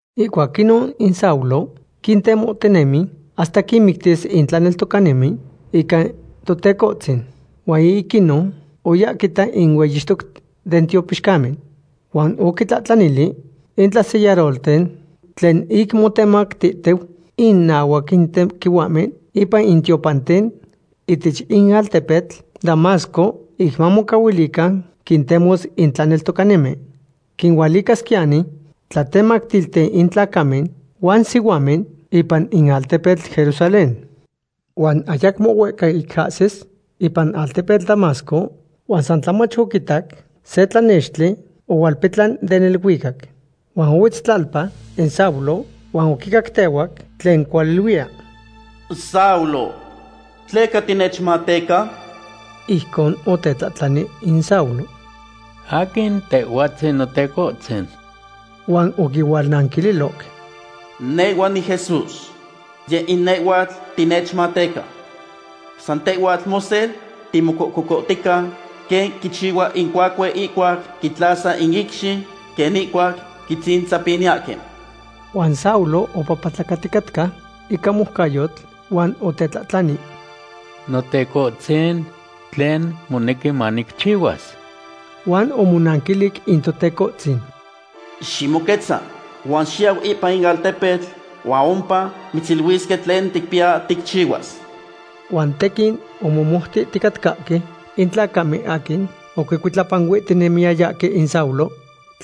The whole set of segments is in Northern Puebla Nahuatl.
Ihcuac inon in Saulo quintemohtinemi hasta quinmictis in tlaneltocanimen ica Totecohtzin. Huan ic inon oya quita in hueyixtoc den tiopixcamen. Huan oquitlahtlanili in tlasellarolten tlen ic motemactihtiu inahuac in tequihuahmen ipan in tiopanten ihtech in altepetl Damasco, ic mamocahuilican quintemos in tlaneltocanimen. Quinualicasquiyani tlatemactilten in tlacamen huan sihuamen ipan in altepetl Jerusalén. Huan ayacmo huehca ic ahsis ipan altepetl Damasco huan san tlamach oquitac se tlanextli ohualpetlan den neluicac. Huan ohuetz tlalpa in Saulo huan oquicactehuac tlen cualiluiya: ―Saulo, ¿tleca tinechmateca? Ijcon otetlahtlani in Saulo: ―¿Aquin Tehhuatzin, Notecohtzin? Huan oquihualnanquililoc: ―Nehhua niJesús. Yeh in nehhuatl tinechmateca. San tehhuatl mosel timocococohtica, quen quichihua in cuacue ihcuac quitlasa in icxi quen ihcuac quitzintzapiniyahque. Huan Saulo opapatlacaticatca ica moucayotl, huan otetlahtlani: ―Notecohtzin, ¿tlen monequi manicchihuas? Huan omonanquilic in Totecohtzin: ―Ximoquetza huan xiyau ipan in altepetl huan ompa mitziluisque tlen ticpiya ticchihuas. Huan tequin omomoutihticatcahque in tlacamen aquin oquicuitlapanuihtinemiyayahque in Saulo,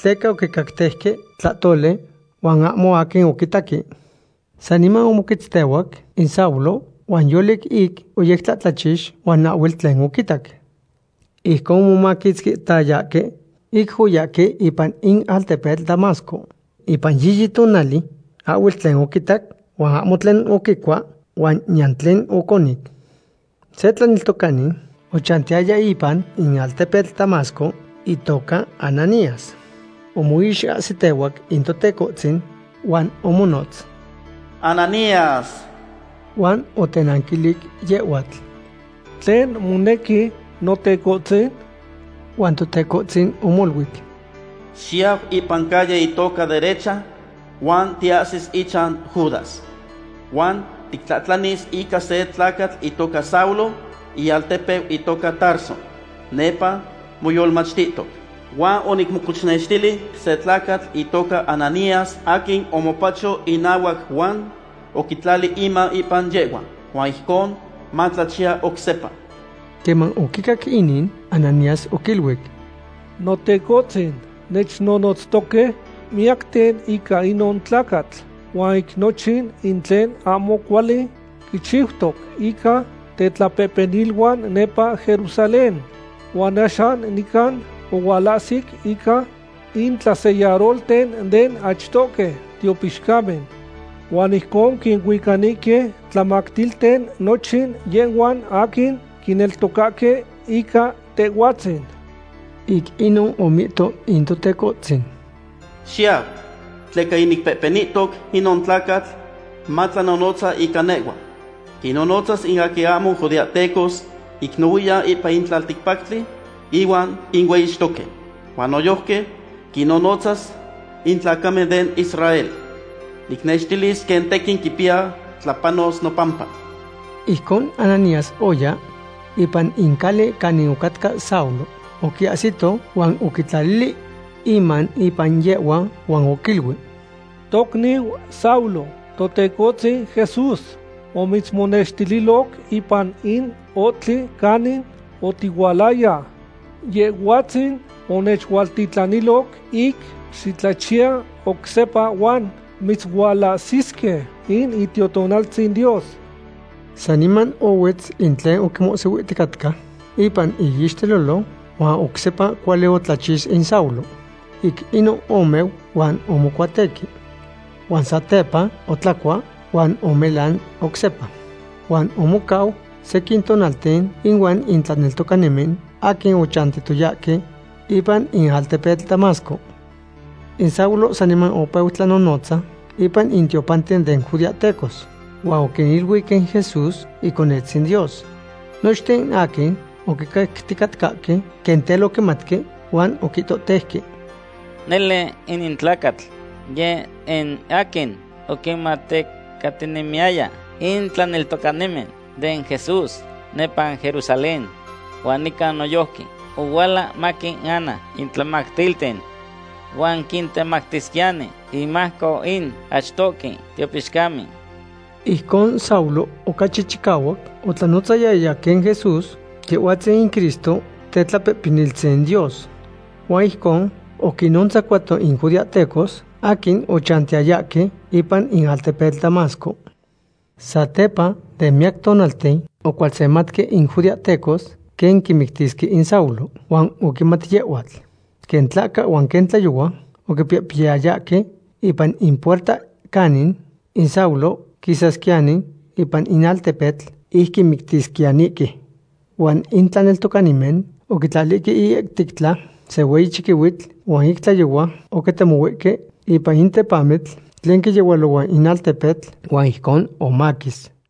tleca oquicacteuque tlahtoli huan ahmo aquin oquitaque. Saniman omoquetztehuac in Saulo, huan yolic ic oyectlahtlachix huan ahhuel tlen oquitac. Ijcon omomaquitzquihtayahque ic oyahque ipan in altepetl Damasco. Ipan yiyi tonali ahhuel tlen oquitac, huan ahmo tlen oquicua huan niyan tlen oconic. Se tlaneltocani ochantiyaya ipan in altepetl Damasco itoca Ananías. Omoixahsitehuac in Totecohtzin huan omonotz: ―¡Ananías! Huan otenanquilic yehhuatl: ―¿Tlen monequi, Notecohtzin? Huan Totecohtzin omoluic: ―Xiyau ipan calle itoca Derecha huan tiahsis ichan Judas. Huan titlahtlanis ica se tlacatl itoca Saulo, ialtepeu itoca Tarso. Nepa moyolmachtihtoc. Huan onicmocochnextili se tlacatl itoca Ananías aquin omopacho inahuac huan oquitlali iman ipan yehhua. Huan ijcon matlachiya oc sepa. Queman oquicac inin, Ananías oquiluic: ―Notecohtzin, nechnonotztoque miyacten ica inon tlacatl, huan ic nochin in tlen ahmo cuali quichiutoc ica tetlapehpeniluan nepa Jerusalén. Huan axan nican ohualahsic ica intlasellarolten den achtohque tiopixcamen. Huan ijcon quinuicanihque tlamactilten nochin yehhuan aquin quineltocahque ica Tehhuatzin. Ic inon omihto in Totecohtzin: ―Xiyau, tleca yinicpehpenihtoc inon tlacatl matlanonotza ica nehhua. Quinnonotzas in aquin ahmo judeahtecos ic nohuiyan ipan in tlalticpactli, ihuan inueyixtoque. Huan noyojqui quinnonotzas in tlacamen den Israel. Nicnextilis quen tequin quipiya tlapanos nopampa. Ijcon Ananías oya ipan in cali canin ocatca Saulo. Oquiahsito huan oquitlalili iman ipan yehhua huan oquiluic: ―Tocniu Saulo, Totecohtzin Jesús omitzmonextililoc ipan in ohtli canic otihualaya. Yehhuatzin onechualtitlaniloc ic xitlachiya oc sepa huan mitzualahsisque in Itiotonaltzin Dios. Saniman ohuetz in tlen oquimohsihuihticatca ipan iixtelolo huan oc sepa cuali otlachix in Saulo. Ic inon omeu huan omocuatequi. Huan satepa otlacua huan omelan oc sepa. Huan omocau sequin tonalten inuan in tlaneltocanimen aquin ochantiyayahque ipan in altepetl Damasco. In Saulo saniman opeu tlanonotza ipan in tiopanten den judeahtecos. Huan oquiniluic in Jesús Iconetzin Dios. Nochten aquin oquicacticatcahque quen tel oquimauteuque huan oquihtohteuque: ―Nele inin tlacatl yeh in aquin oquinmatecatinemiyaya in tlaneltocanimen den Jesús nepa Jerusalén. Huan nican noyojqui ohuala maquinana in tlamactilten. Huan quintemactisquiyani inmajco in achtohque tiopixcamen. Ijcon Saulo ocachi chicahuac otlanonotzayaya quen Jesús, Yehhuatzin in Cristo Tetlapehpeniltzin Dios. Huan ijcon oquinnontzacuato in judeahtecos aquin ochantiyayahque ipan in altepetl Damasco. Satepa den miyac tonalten ocualsematque in judeahtecos quen quimictisque in Saulo. Huan oquimat yehhuatl. Quen tlahca huan quen tlayohua oquipihpiyayahque ipan in puerta canin in Saulo quisasquiyani ipan in altepetl ic quimictisquiyanihque. Huan in tlaneltocanimen oquitlalihque iihtectla se hueyi chiquihuitl huan ic tlayohua oquitemohuihque ipan in tepamitl tlen quiyehualohua in altepetl huan ijcon omaquis.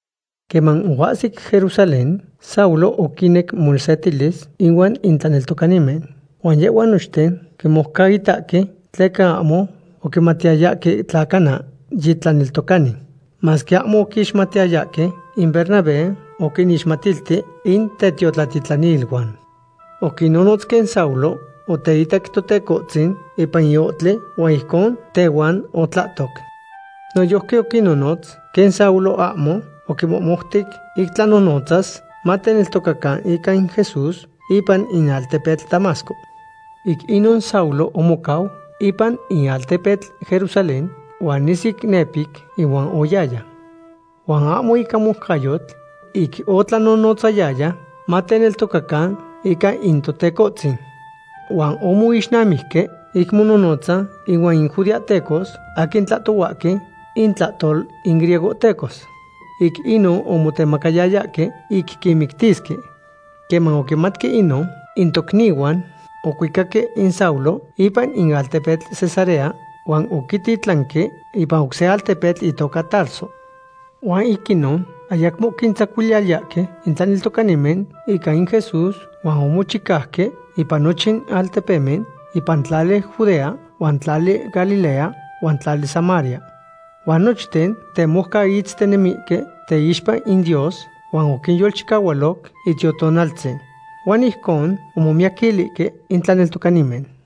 Queman oahsic Jerusalén Saulo oquinec mosetilis inuan in tlaneltocanimen. Huan yehhuan nochten quimoucaitahque, tleca ahmo oquimatiyayahque tla cana yi tlaneltocani. Masque ahmo oquixmatiyayahque, in Bernabé oquinixmatilti in tetiotlatitlaniluan. Oquinnonotz quen Saulo oteitac Totecohtzin ipan in ohtli huan ijcon tehuan otlahtoc. Noyojqui oquinnonotz quen Saulo ahmo oquimohmoutic ic tlanonotzas mateneltocacan ica in Jesús ipan in altepetl Damasco. Ic inon Saulo omocau ipan in altepetl Jerusalén huan nisic nepic inuan oyaya. Huan ahmo ica moucayotl ic otlanonotzayaya mateneltocacan ica in Totecohtzin. Huan omoixnamijque ic monohnotza ihuan in judeahtecos aquin tlahtohuahque intlahtol in griegohtecos. Ic inon omotemacayayahque ic quimictisque. Queman oquimatque inon, in tocnihuan ocuicaque in Saulo ipan in altepetl Cesarea, huan oquititlanque ipan oc se altepetl itoca Tarso. Huan ic inon ayacmo oquintzacuiliyayahque in tlaneltocanimen ica in Jesús huan omochicauque ipan nochin altepemen ipan tlali Judea huan tlali Galilea huan tlali Samaria. Huan nochten temoucaitztinemihque teixpa in Dios huan oquinyolchicahualoc Itiotonaltzin. Huan ijcon omomiyaquilihque in tlaneltocanimen.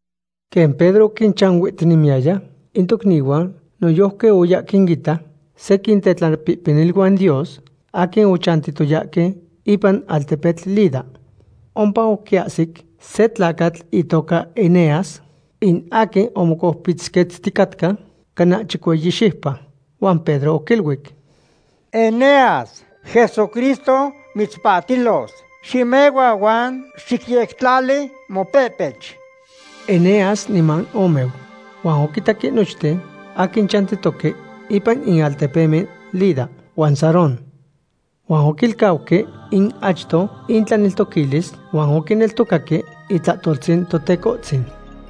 Quen Pedro oquinchanuihtinemiyaya in tocnihuan, noyojqui oya quinita sequin tetlapehpeniluan Dios aquin ochantiyayahque ipan altepetl Lida. Ompa oquiahsic se tlacatl itoca Eneas, in aquin omocoupitzquetzticatca cana chicueyi xiupa. Huan Pedro oquiluic: ―Eneas, Jesucristo mitzpahtilos. Ximehua huan xicyectlali mopehpech. Eneas niman omeu. Huan oquitaque nochten aquin chantihque ipan in altepemen Lida huan Sarón. Huan oquilcauque in achto intlaneltoquilis huan oquineltocaque itlahtoltzin Totecohtzin.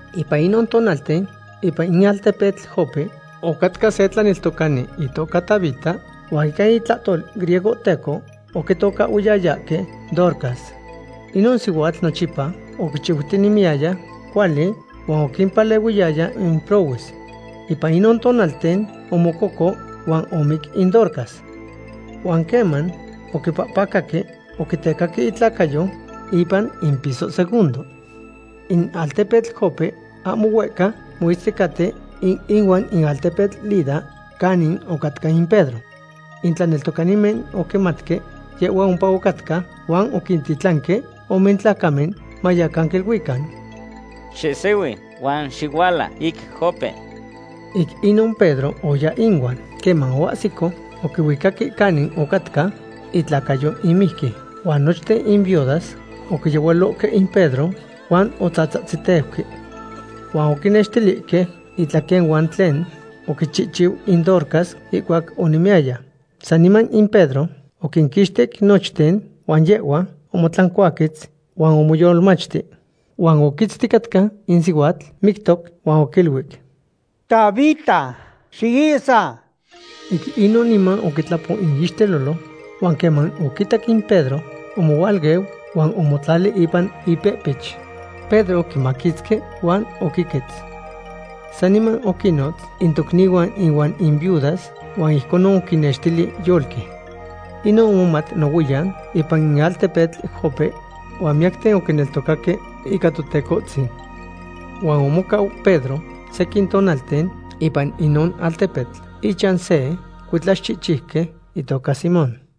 Ipan inon tonalten ipan in altepetl Jope ocatca se tlaneltocani itoca Tabita, huan ica itlahtol griegohteco oquitocahhuiyayahque Dorcas. Inon sihuatl nochipa oquichiutinemiyaya cuali huan oquimpalehuiyaya in prohues. Ipan inon tonalten omococo huan omic in Dorcas. Huan queman oquipahpacaque, oquitecaque itlacayo ipan in piso segundo. In altepetl Jope ahmo huehca moitzticaten ihuan in altepetl Lida, canin ocatca in Pedro. In tlaneltocanimen oquimatque yehhua ompa ocatca huan oquintitlanque ome tlacamen mayacan quiluican: ―Xihsihui huan xihuala ic Jope. Ic inon Pedro oya inuan. Queman oahsico, oquihuicahque canin ocatca itlacayo in mijqui. Huan nochten in viudas oquiyehualohque in Pedro huan otzatzahtziteuque. Huan oquinextilihque itlaquenuan tlen oquichihchiu in Dorcas ihcuac onemiyaya. Saniman in Pedro oquinquixtic nochten huan yehhua omotlancuaquetz huan omoyolmachti. Huan oquitzticatca in sihuatl mictoc huan oquiluic: ―Tabita, xiihsa. Ic inon niman oquitlapo iixtelolo huan queman oquitac in Pedro, omohualeu huan omotlali ipan ipehpech. Pedro oquimaquitzqui huan oquiquetz. Saniman oquinnotz in tocnihuan ihuan in viudas, huan ijconon oquinnextili yolqui. Inon omomat nohuiyan ipan in altepetl Jope, huan miyacten oquineltocaque ica Totecohtzin. Huan omocau Pedro sequin tonalten ipan inon altepetl, ichan se cuitlaxchihchiuqui itoca Simón.